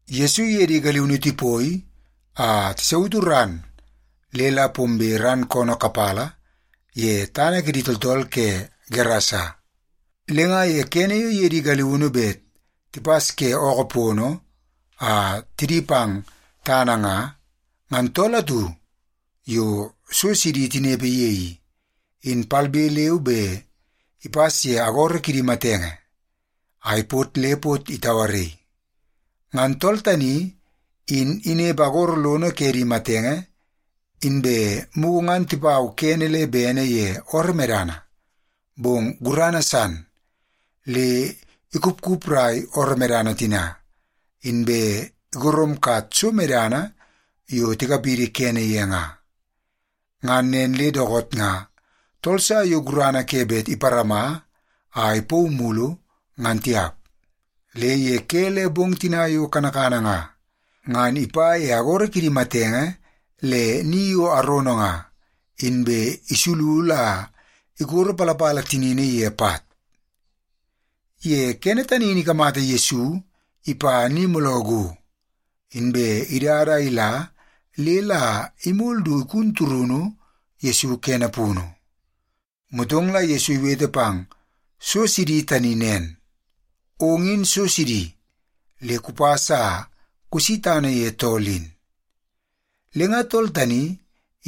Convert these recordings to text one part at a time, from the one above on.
Yesu iye di galiunu tipoi a tisautu ran le la pombe ran koonoo kapala ye tana kidi tooltool ke Gerasa. Le nga ye kene yo iye di galiunu bet tipas ke ookoo pono a tidi pang tana nga, ngan tool atu yo so sidi tinepe ye i, in palbe leu be ipas ye agoro kidi matenge a ipot le pot itauaraii. Ngan tool tani in inepe agoro lono ke di matenge, inbe mugu ngan tipau kene le bene ye ooroo medana, bong gurana san le ikupkuprai ooroo medana tina, inbe igoromkat so medana yo tikapidi kene ye nga. Ngan nen le dookoot nga tool sa yo gurana ke bet iparama a ipauu mulu, ngan tiap. Le ye ke le bong tina yo kanakana nga, ngan ipa ye agoro kidi matenge le ni yo arono nga, inbe isululu a ikoropalapala tinini ye pat. Ye kene tani in ikamata Yesu ipa ni mooloo go, inbe idada a ila le la imol du igun turunu Yesu kene punu. Motong la Yesu iwete pang so sidi tani nen, “Ong in so sidi, le kupas a kusi tana ye tool in!” Le nga tool tani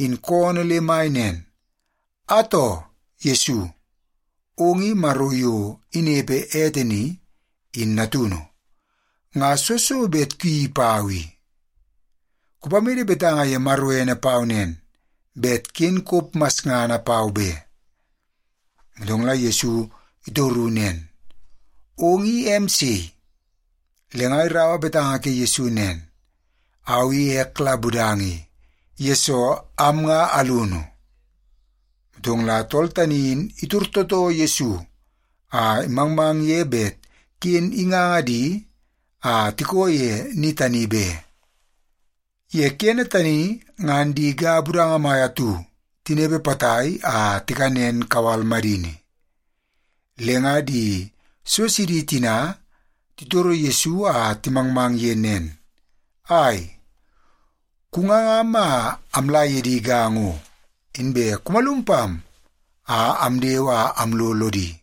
in koonoo le mai nen, “Atoo! Yesu, ong i Maro yo inepe ete ni, in natunu! Nga soo so bet kuyeii pau i? Kupamede betanga ye Maro ene pau nen, bet ken kop masngana pau be.” Motong la Yesu itoru nen, “Ong i em sei?” Le nga iraua betanga ke Yesu nen, “Au i ek la Budanga i, yesoo am nga alunu.” Motong la tool tani in itor tootoo Yesu a imangmang ye bet ken inganga di a tikoo ye ni tani be. Ye kene tani ngan di ga budanga mai atu tinepe potai a tikanen kawal madini. Le nga di so sidi tina titoro Yesu a timangmang ye nen, “Ai, kungangam a amla ye di ga ngo, inbe kumalum pam a amdewe a amlo lodi.”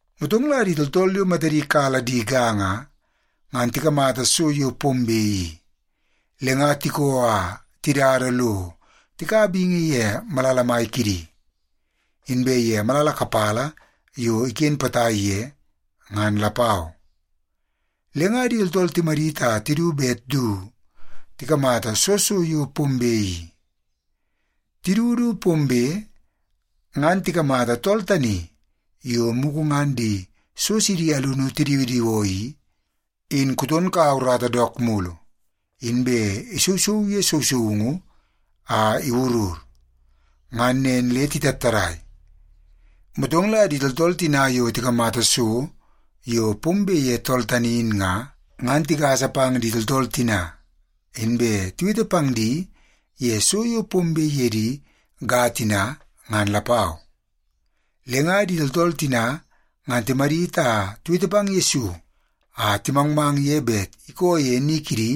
Motong la di tooltool yo matadi kala di ga nga, ngan tikamata so yo pombe i, le nga tikoo a tidada lo tikaua bingi ye malala mai kidi, inbe ye malala kapala yo iken potai ye, ngan lapau. Le nga di tooltool timadit a tidu bet du tikamata soo so yo pombe i. Tidu du pombe, ngan tikamata tool tani yo mugu ngan di so sidi alunu tidiwidiwoo i, in kuton kaua urata dook mulu, inbe isousou ye sousoungu a iwurur. Ngan nen le titattadai. Motong la di tooltool tina yo tikamata so yo pombe ye tool tani in nga, ngan tigasa pang di tooltool tina, inbe tiwete pang di ye so yo pombe ye di ga tina, ngan lapau. Le nga di tooltool tina ngan timadit a tiwete pang Yesu a timangmang ye bet ikoo ye ni kidi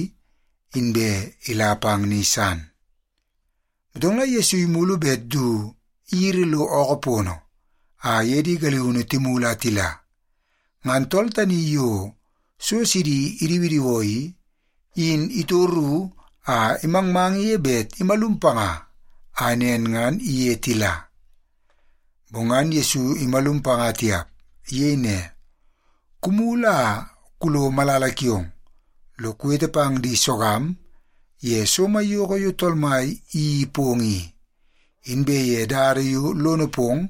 inbe ila pang ni san. Motong la Yesu imulu bet du iyiri lo ookoo pono a iye di galiunu timulu a tila, ngan tool tani yo so sidi idiwidiwoo i, in itoru a imangmang ye bet imalum panga a nen ngan iye tila. Bong ngan Yesu imalum panga tiap. Iyei ne, “Kumulu a kulo malala kiong lo kuwete pang di sogam ye so maiyoko yo Tool Mai iyeii pong i, inbe ye dada yo lono pong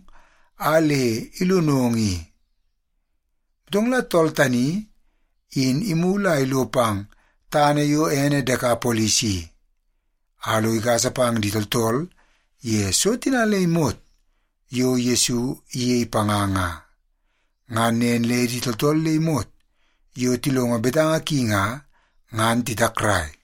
a le ilonong ye i.” Motong la tool tani in imulu a ilo pang tana yo ene Dekapolis i, a lo igasa pang di tooltool ye so tina le imot yo Yesu iyei panga nga. Ngan nen le di tooltool le imot yo tilongo betanga ki nga, ngan titakrai.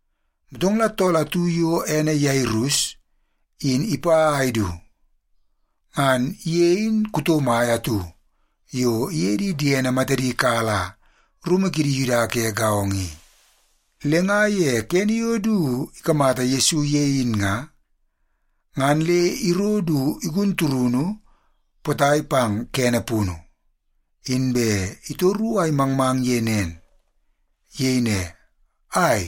Motong la tool atu yo ene Yairus in ipa a idu. Ngan ye in kuto mai atu yo iye di diene matadi kala rumu kidi Yuda ke gaongo i. Le nga ye kene yo du ikamata Yesu ye in nga, ngan le iro du igun turunu potai pang kene punu, inbe itoru a imangmang ye nen. Iyei ne, “Ai,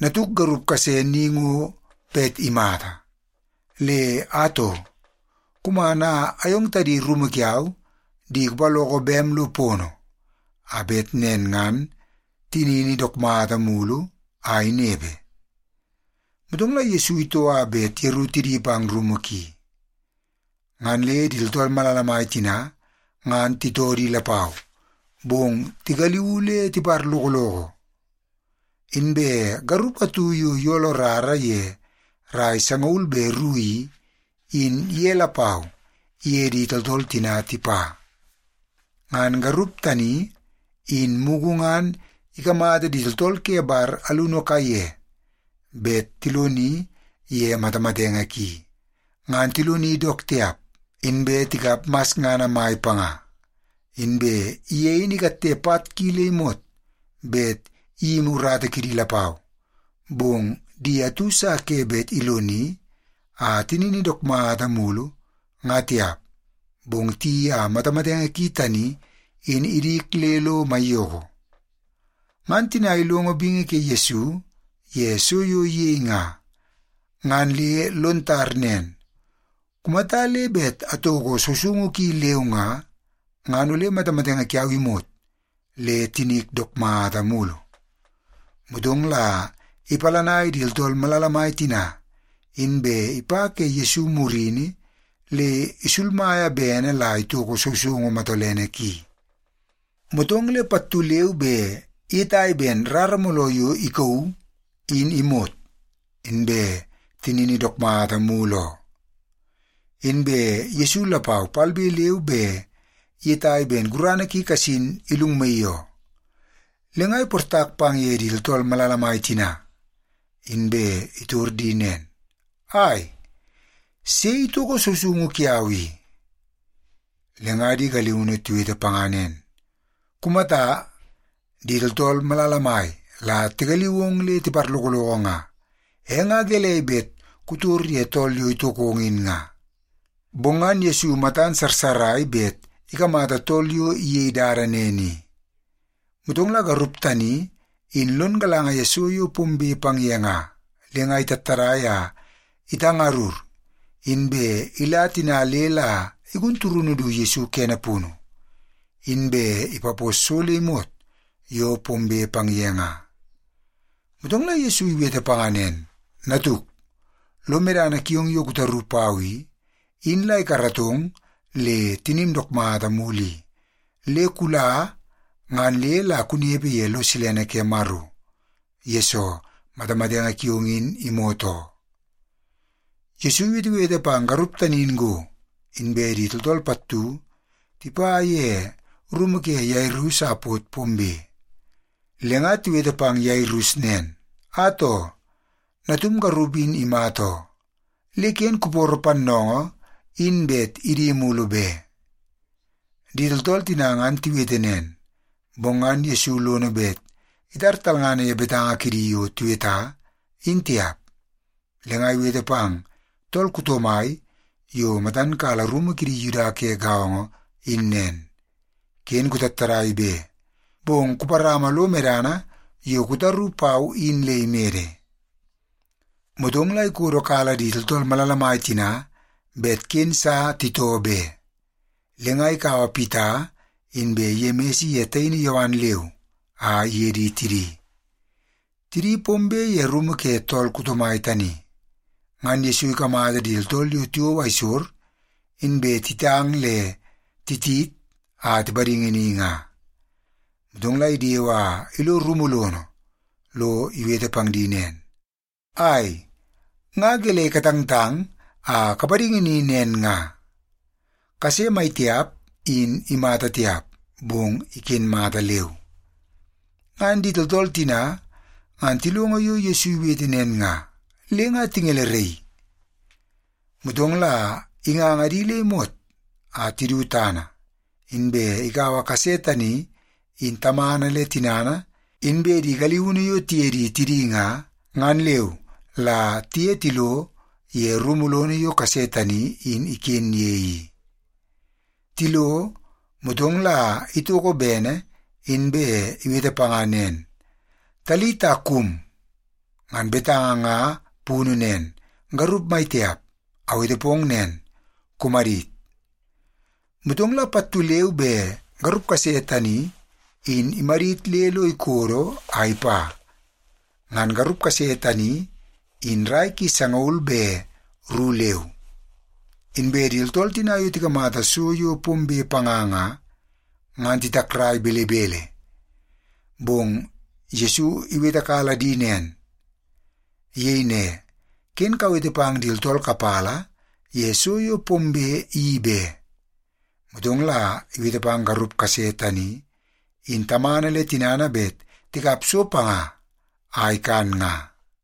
natuk garup kase ni ngo bet imata. Le atoo, kuman a ayong tadi rumu kiau di kupaloko bem lo pono, a bet nen ngan tinini dook mata mulu a inepe.” Motong la Yesu itoo a bet yeru tidi pang rumu ki. Ngan le di tooltool malala mai tina ngan titoo di lapau, bong tigaliuu le tiparlokoloko. Inbe garup atu yo iyolo rara ye rai sangaul be ru i, in ye lapau iye di tooltool tina tipa. Ngan garup tani, in mugu ngan ikamata di tooltool ke bar alunu kaiye bet tiloni ye matamatenge ki, ngan tiloni dook tiap, inbe tikap masngana mai panga. Inbe ye in ikatte pat ki le imot bet iyimi urata kidi lapau, bong di atu sa ke bet iloni a tinini dook mata mulu nga tiap, bong tiyeii a matamatenge ki tani in idik le lo maiyoko. Ngan tina ilongo bingi ke Yesu ye so yo iyei nga, ngan le lon tar nen, “Kumata le bet atoko sousoungu ki leu nga, ngan ole matamatenge kiau imot le tinik dook mata mulu.” Motong la ipalanai di tooltool malala mai tina, inbe ipa ke Yesu murini le isulmaia bene la itoko sousoungu matolene ki. Motong le pattu leu be iyetai ben rara mooloo yo ikauu, in imot, inbe tinini dook mata mulu oo. Inbe Yesu lapau palbe leu be iyetai ben gurana ki kasin ilungmaii oo. Le nga iportak pang ye di tooltool malala mai tina, inbe itor di nen, “Ai, sei itoko sousoungu kiau i?” Le nga di galiunu tiwete panga nen, “Kumata, di tooltool malala mai la tigaliu ong le tiparlokoloko nga. E nga gelei bet kutor ye tool yo itokong in nga?” Bong ngan Yesu matan sarsarai bet ikamata tool yo iyei dada nen i. Motong la garup tani in lon galanga ye so yo pombe pang ye nga, le nga itattadai a itangarur, inbe ila tina le la igun turunu du Yesu kene punu, inbe ipapos so le imot yo pombe pang ye nga. Motong la Yesu iwete panga nen, “Natuk, lo medana kiong yo kutaru pau i, in la ikaratong le tinim dook mata mulu i. Le kula ngan le la kunepe ye lo silene ke Maro, yesoo matamatenge kiong in imot oo.” Yesu iwetewete pang garup tani in go, inbe di tooltool pattu tipa ye rumu ke Yairus a pot pombe. Le nga tiwete pang Yairus nen, “Atoo, natum garup in imata oo. Le ken kuporo pannoongoo in bet idi mulu be.” Di tooltool tina ngan tiwete nen, bong ngan Yesu lono bet itar talngana ye betanga kidi yo tiweta, in tiap. Le nga iwete pang tool kuto mai yo matan kala rumu kidi Yuda ke gaongo in nen, “Ken kutattadai be, bong kuparama lo medana yo kutaru pau in le imede.” Motong la ikodokala di tooltool malala mai tina bet ken sa titoo be. Le nga ikaua Pita inbe Yemis iye taini Yowan leu a iye di tidi. Tidi pombe ye rumu ke tool kuto mai tani, ngan Yesu ikamata di tooltool yo tiwou aisor, inbe titang le titit a tipadingi ni nga. Motong la idewe a ilo rumu lono lo iwete pang di nen, “Ai, nga gelei katangtang a kapadingi ni nen nga? Kase maitiap in imata tiap, bong iken mata leu.” Ngan di tooltool tina ngan tilongo yo Yesu iwete nen nga, le nga tingeleraii. Motong la inganga di le imot a tidu tana, inbe ikaua kase tani in tamana le tinana inbe di galiunu yo tiye di tidi nga, ngan leu la tiye tilo ye rumu lono yo kase tani in iken ye i. Tilo, motong la itoko bene inbe iwete panga nen, “Talita kum!” Ngan betanga nga punu nen, “Garup maitiap, awete pong nen, kumadit!” Motong la pattu leu be garup kase tani in imadit le lo ikodo a ipa. Ngan garup kase tani in rai ki sangaul be ru leu. Inbe di tooltool tina yo tikamata so yo pombe panga nga, ngan titakrai belebele. Bong Yesu iwetekala di nen. Iyei ne, “Ken kawete pang di tooltool kapala ye so yo pombe i be.” Motong la iwete pang garup kase tani in tamana le tinana bet tikap so panga a ikan nga.